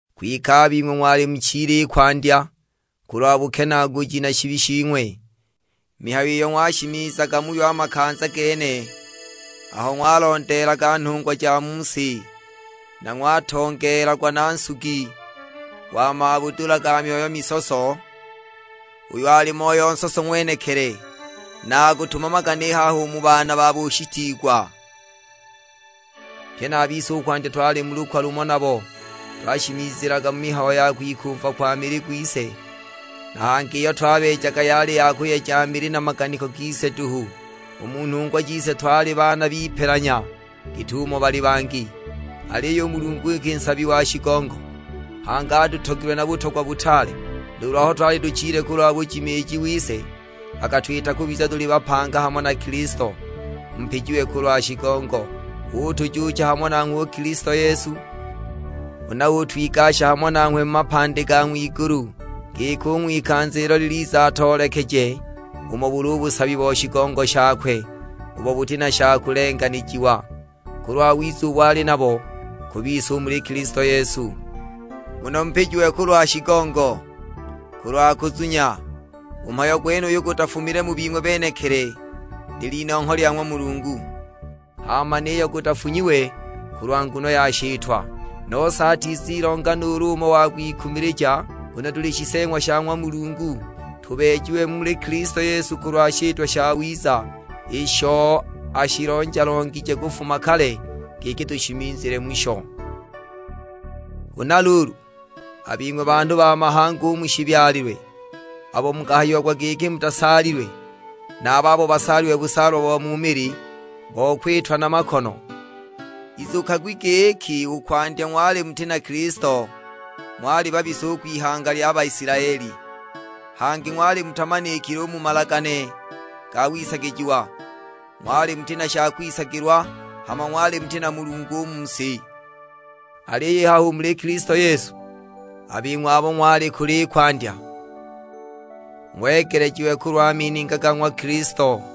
Kwike a bing'we ng'wali muchile i kwandya, kulwa bukenaaguji na shibi shing'we; mihayo iyo ng'washimizaga muyo a makanza gene, aho ng'walondeelaga nhungwa ja mu si, na ng'watongeelagwa nu nsugi wa mabudula ga myoyo misoso, uyo ali Moyo nsoso ng'wenekili, na akutumamaga ni haha u mu baana ba bushitiigwa! Pye na a bise i kwandya twali mu lukwa lumo nabo, twashimizilaga mu mihayo ya kwikumva kwa mili gwise, na hangi iyo twabeejaga yali ya kuyeja mili na maganiko gise duhu; u mu nhungwa jise twali baana b'ipelanya git'umo bali a bangi. Aliyo u Mulungu iki nsabi wa shigongo, hangi atutogilwe na butogwa butaale, nuulu aho twali tuchile kulwa bujimiiji wise, akatwita kubiza tuli bapanga hamo na Kilisto, (mupijiwe kulwa shigongo). Utujuucha hamo nanghwe u Kilisto Yesu, huna utwigasha hamo nanghwe mu mapandi ga ng'wigulu, giki u ng'wikanza ilo liliza atoolekeje umo buli u busabi bo shigongo shakwe ubo buti na sha kugelanijiwa, kulwa wiza ubo ali nabo ku bise u muli Kilisto Yesu. Nguno mupijiwe kulwa shigongo, kulwa kuzunya; u mhayo gwenuyu gutafumile mu bing'we benekili, lil'inongho lya ng'wa Mulungu. Hama niyo gutafunyiwe kulwa nguno ya shitwa, nose atizilonga nuulu umo wa kwikumilija. Nguno tuli shiseeng'wa sha ng'wa Mulungu, tubeejiwe muli Kilisto Yesu kulwa shitwa shawiza, isho ashilonja-longije kufuma kale giki tushimizile musho. Huna luulu, a bing'we banhu ba mahanga u mu shibyalilwe, abo mukahayiagwa giki mutasaalilwe, na a babo basaalilwe busaalwa bo mu mili, bo kwitwa na makono; izukagwi giki i kwandya ng'wali muti na Kilisto, ng'wali babisa u kwihanga lya Baisilaeli, hangi ng'wali mutamanikile u mu malagane ga wisagijiwa, ng'wali muti na sha kwisagilwa, hama ng'wali muti na Mulungu u mu si! Aliyo i haha u muli Kilisto Yesu, a bing'we abo ng'wali kule i kwandya, ng'wegelejiwe kulwa mininga ga ng'wa Kilisto.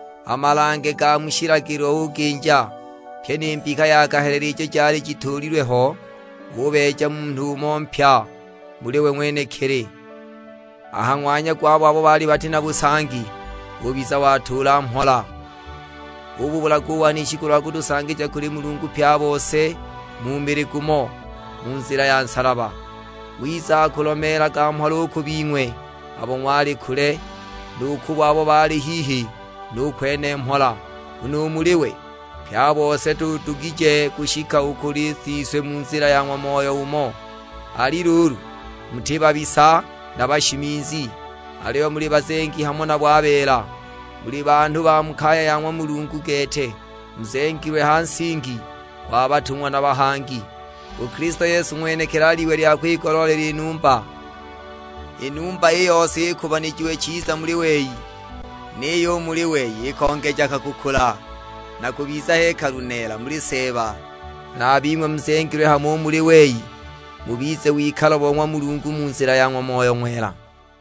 A malange ga mu shilagilo uginja, pyi ni mbika ja kahelele ijo jali jituulilwe ho; ubeeja munhu umo mpya muli we ng'wenekili, a ha ng'wanya gwabo abo baali bati na busangi; ubiza watuula mhola. Ububulaga u wanishi kulwa kutusangija kuli Mulungu pye a bose mu mili gumo, mu nzila ya nsalaba! Wiza akulomeelaga mhola u ku bing'we abo ng'wali kule, nu kubo abo baali hihi nu kwene mhola. Nguno u muli we, pye a bose tudugije kushika u kuli Siswe mu nzila ya ng'wa Moyo umo. Ali luulu, muti babisa na bashimizi, aliyo muli bazengi hamo nabo a beela. Muli banhu ba mu kaya ya ng'wa Mulungu gete. Muzengilwe ha nsingi gwa batung'wa na bahangi, u Kilisto Yesu ng'wenekili ali Iwe lya kwigoloolela i numba. I numba i yose ikubanijiwe chiza muli wei; niyo u muli wei ikongejaga kukula na kubiza hekalu neela muli Seeba. Na a bing'we muzengilwe hamo u muli wei, mubize wikalo bo ng'wa Mulungu mu nzila ya ng'wa Moyo wakwe.